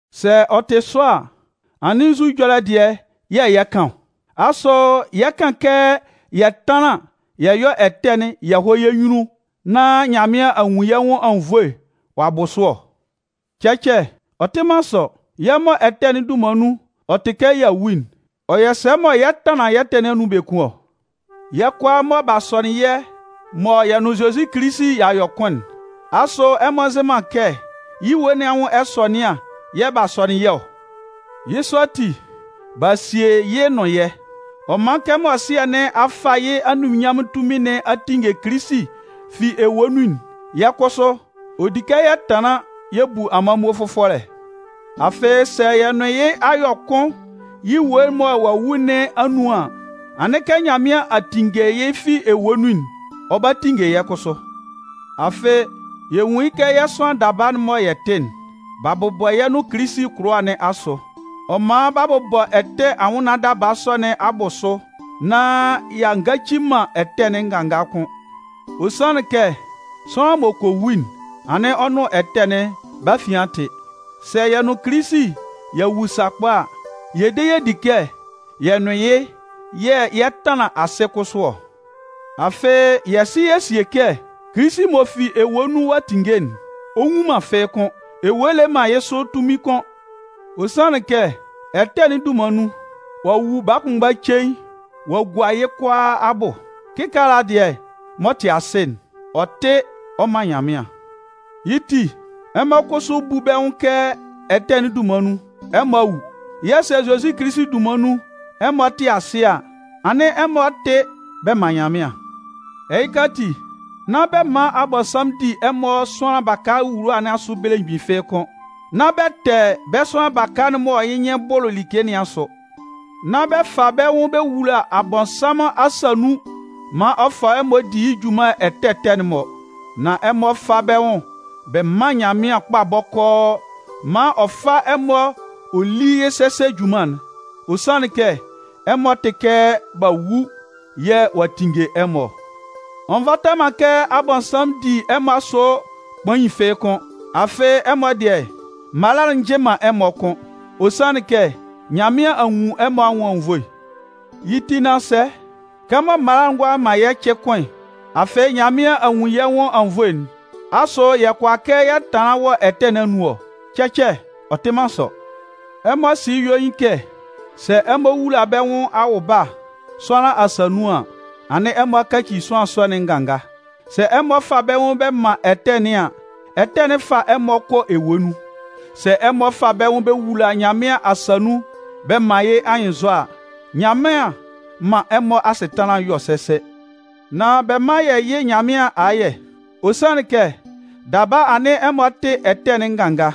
Sɛ ɔ tɩ sɔ a, anɩn nzu ɛjɔlɛ dɩɛ yɛ̂ yɛ 'kan ɔ? Asʋ yɛ 'kan kɛ yɛ tánlan yɛ yɔ́ ɛtɛ'n yɛ hɔ́ yɛ́ nyunnun nán Nyanmɩan a nwun yɛ́ nwʋn anwunnvoe ɔ'a bʋ sʋ ɔ? Cɛcɛ! Ɔ tɩ man sɔ! Yɛ́ mɔ ɛtɛ'n dunman nun ɔ tɩ kɛ y'a wu'n, ɔ yɔ sɛ mɔ yɛ 'tanlan yɛ́ ɛtɛ nɩn anun biekun ɔ? Yɛ́ kʋalaa mɔ b'a sɔnɩn yɛ́ mɔ yɛ nʋn Zozi Kilisi y'a yɔ kʋn'n, asʋ ɛmɔ nzɩ man kɛ yɩ́ ewue nɩn anwʋn ɛsɔnɩan yɛ̂ b'a sɔnɩn yɛ́ ɔ? Yɩ́ sɔ ati, b'a sie yɩ́ nʋn yɛ́. Ɔ man kɛmɔ Sɩɛ nɩn a fa yɩ́ anunminnyanmʋn tunmin nɩn a tinnge Kilisi fi ewue nun'n, yɛ́ kʋsʋ, ɔ di kɛ yɛ tanlan yɛ bu amanmuo fʋfɔlɛ. Afɩ, sɛ yɛ nʋn yɩ́ a yɔ kʋn yɩ́ ewue mɔ ɔ'a wu nɩn anun an, anɩn kɛ Nyanmɩan a tinnge yɩ́ fi ewue nun'n, ɔ 'ba tinnge yɛ́ kʋsʋ. Afɩ, yɛ nwun yɩ́ kɛ yɛ́ sʋanlan daba'n mɔ yɛ tɩ'n, b'a bʋbɔ yɛ́ nʋn Kilisi kʋlʋwa nɩn asʋ. Ɔ man b'a bɔ ɛtɛ anwʋnnaan daba sɔ nɩn abʋsʋ nán y'a ngaci nan ɛtɛ'n nganga kʋ́n. Ɔ sanlɩn kɛ sʋanlan m'ɔ kɔ wu'n, anɩn ɔ nʋn ɛtɛ'n bɛ́ afian a tɩ. Sɛ yɛ nʋn Kilisi y'a wu sakpa a, yɛ de yɛ di kɛ, yɛ nʋn yɩ́ yɛ̂ yɛ 'tanlan asɩ kʋsʋ ɔ. Afɩ, yɛ sɩ yɛ sie kɛ Kilisi m'ɔ fi ewue nun ɔ'a tinnge'n, ɔ nwu man fɩ́ɩ́ kʋ́n. Ewue le man yɩ́ sʋ tunmin kʋ́n. Ɔ sanlɩn kɛ ɛtɛ'n dunman nun, ɔ'a wu baa kʋnmgba cein ɔ a gua yɩ́ kʋalaa abʋ. Kɩkaala dɩɛ m'ɔ tɩ asɩ'n, ɔ tɩ ɔ man Nyanmɩan. Yɩ́ ti, ɛmɔ kʋsʋ bú bɛ́ nwʋn kɛ ɛtɛ'n dunman nun, ɛmɔ a wu. Yɛ̂ sɛ Zozi Kilisi dunman nun ɛmɔ tɩ asɩ a, anɩn ɛmɔ tɩ bɛ man Nyanmɩan. Ɛhɩka ati, nán bɛ man Abɔnsanmʋn di ɛmɔ sʋanlan baka wuluwa nɩn asʋ belemgbin fɩ́ɩ́ kʋ́n. Nán bɛ tɛ bɛ́ sʋanlan baka'n mɔ yɩ́ nyɩn bʋlʋ like nɩn asʋ. Nán bɛ fa bɛ́ nwʋn bɛ wula Abɔnsanmʋn asa nun maan ɔ fa ɛmɔ di yɩ́ junman ɛtɛ ɛtɛ'n-mɔ. Nan ɛmɔ fá bɛ́ nwʋn bɛ mán Nyanmɩan kpa bɔkɔɔ maan ɔ fá ɛmɔ ɔ lí yɩ́ sɛsɛ junman'n. Ɔ sanlɩn kɛ ɛmɔ tɩ kɛ b'a wu yɛ̂ ɔ'a tinnge ɛmɔ ɔ. Ɔ nvata man kɛ Abɔnsanmʋn di ɛmɔ asʋ kpain fɩ́ɩ́ kʋ́n. Afɩ, ɛmɔ dɩɛ, mala'n nji man ɛmɔ kʋ́n. Ɔ sanlɩn kɛ Nyanmɩan a nwun ɛmɔ anwʋn anwunnvoe. Yɩ́ ti nán sɛ? Kɛmɔ mala'n ngʋala man yɛ́ cɩ kʋ́n, afɩ Nyanmɩan a nwun yɛ́ nwʋn anwunnvoe'n, asʋ yɛ kʋala kɛ yɛ tanlan wɔ ɛtɛ nɩn anun ɔ? Cɛcɛ! Ɔ tɩ man sɔ. Ɛmɔ sɩ yɩ́ yuein kɛ sɛ ɛmɔ wula bɛ́ nwʋn awʋba sʋanlan asa nun an, anɩn ɛmɔ a kaci sʋanlan sɔ'n nganga. Sɛ ɛmɔ fa bɛ́ nwʋn bɛ man ɛtɛ nɩn an, ɛtɛ'n 'fa ɛmɔ kɔ ewue nun. Sɛ ɛmɔ fa bɛ́ nwʋn bɛ wula Nyanmɩan asa nun bɛ man yɩ́ anyɩnnzɔ a, Nyanmɩan 'man ɛmɔ asɩtanlan'n yɔ sɛsɛ. Nan bɛ mán yɛ yɩ́ Nyanmɩan ayɛ, ɔ sanlɩn kɛ daba anɩn ɛmɔ tɩ ɛtɛ'n nganga.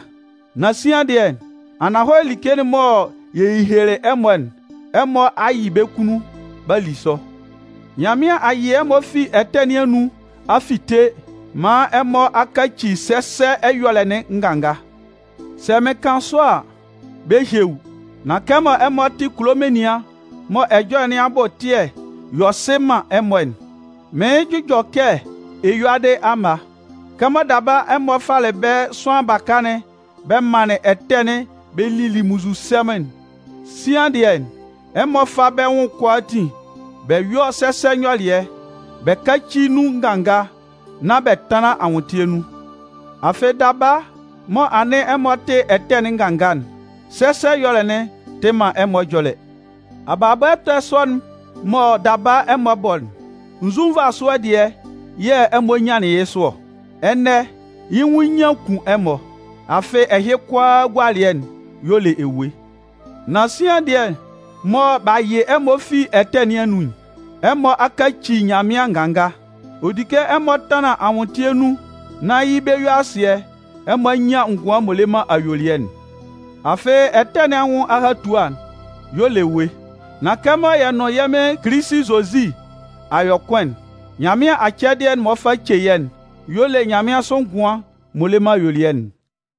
Nan sian dɩɛ, ananhɔlɛ like'n mɔ yɛ hehelelɩ ɛmɔ'n, ɛmɔ a yɩ bɛ́ kunnun b'a li sʋ. Nyanmɩan a yɩ ɛmɔ fi ɛtɛ nɩn anun a fite man ɛmɔ a kaci sɛsɛ ɛyɔlɛ'n nganga. Sɛ mɩn kan sɔ a, bɛ́ ehie wú. Nan kɛmɔ ɛmɔ tɩ kulo menian mɔ ɛjɔlɛ nɩn abʋ ɛtɩɛ yɔ sɩ man ɛmɔ'n, mɩɩn jʋjɔ kɛ eyuadɩ amma. Kɛmɔ daba ɛmɔ falɩ bɛ́ sʋanlan baka'n bɛ manlɩn ɛtɛ'n bɛ lili munnzusɛmʋn'n, sian dɩɛ, ɛmɔ fá bɛ́ nwʋn'n kʋalaatin bɛ yɔ́ sɛsɛ nyɔlɩɛ, bɛ káci nun nganga, nán bɛ tánlan anwʋntɩɛ nun. Afɩ daba, mɔ anɩn ɛmɔ tɩ ɛtɛ'n nganga'n, sɛsɛ ɛyɔlɛ'n tɩ man ɛmɔ ɛjɔlɛ. Abalabɔ ɛtɛ sɔ'n mɔ daba ɛmɔ bɔ'n, nzu nvasʋɛ dɩɛ yɛ̂ ɛmɔ nyanlɩn yɩ́ sʋ ɔ? Ɛnɛ yɩ́ nwʋn nyian kun ɛmɔ. Afɩ, ɛhɩ kʋalaa agualɩɛ y'ɔ le ewue. Nan sian dɩɛ mɔ b'a yɩ ɛmɔ fi ɛtɛ nɩn anun'n, ɛmɔ a kaci Nyanmɩan nganga. Ɔ di kɛ ɛmɔ tanlan anwʋntɩɛ nun nán yɩ́ bɛ-yue-asɩɛ, ɛmɔ a nyan ngʋan m'ɔ le man ayuelɩɛ'n. Afɩ ɛtɛ nɩn anwʋn ahatua y'ɔ le ewue. Nan kɛmɔ yɛ nʋn yɛ́ Mɩn Kilisi Zozi a yɔ kʋn'n, Nyanmɩan acɛdɩɛ'n m'ɔ fa ce yɛ́'n y'ɔ le nyanmɩansʋ ngʋan m'ɔ le man ayuelɩɛ'n.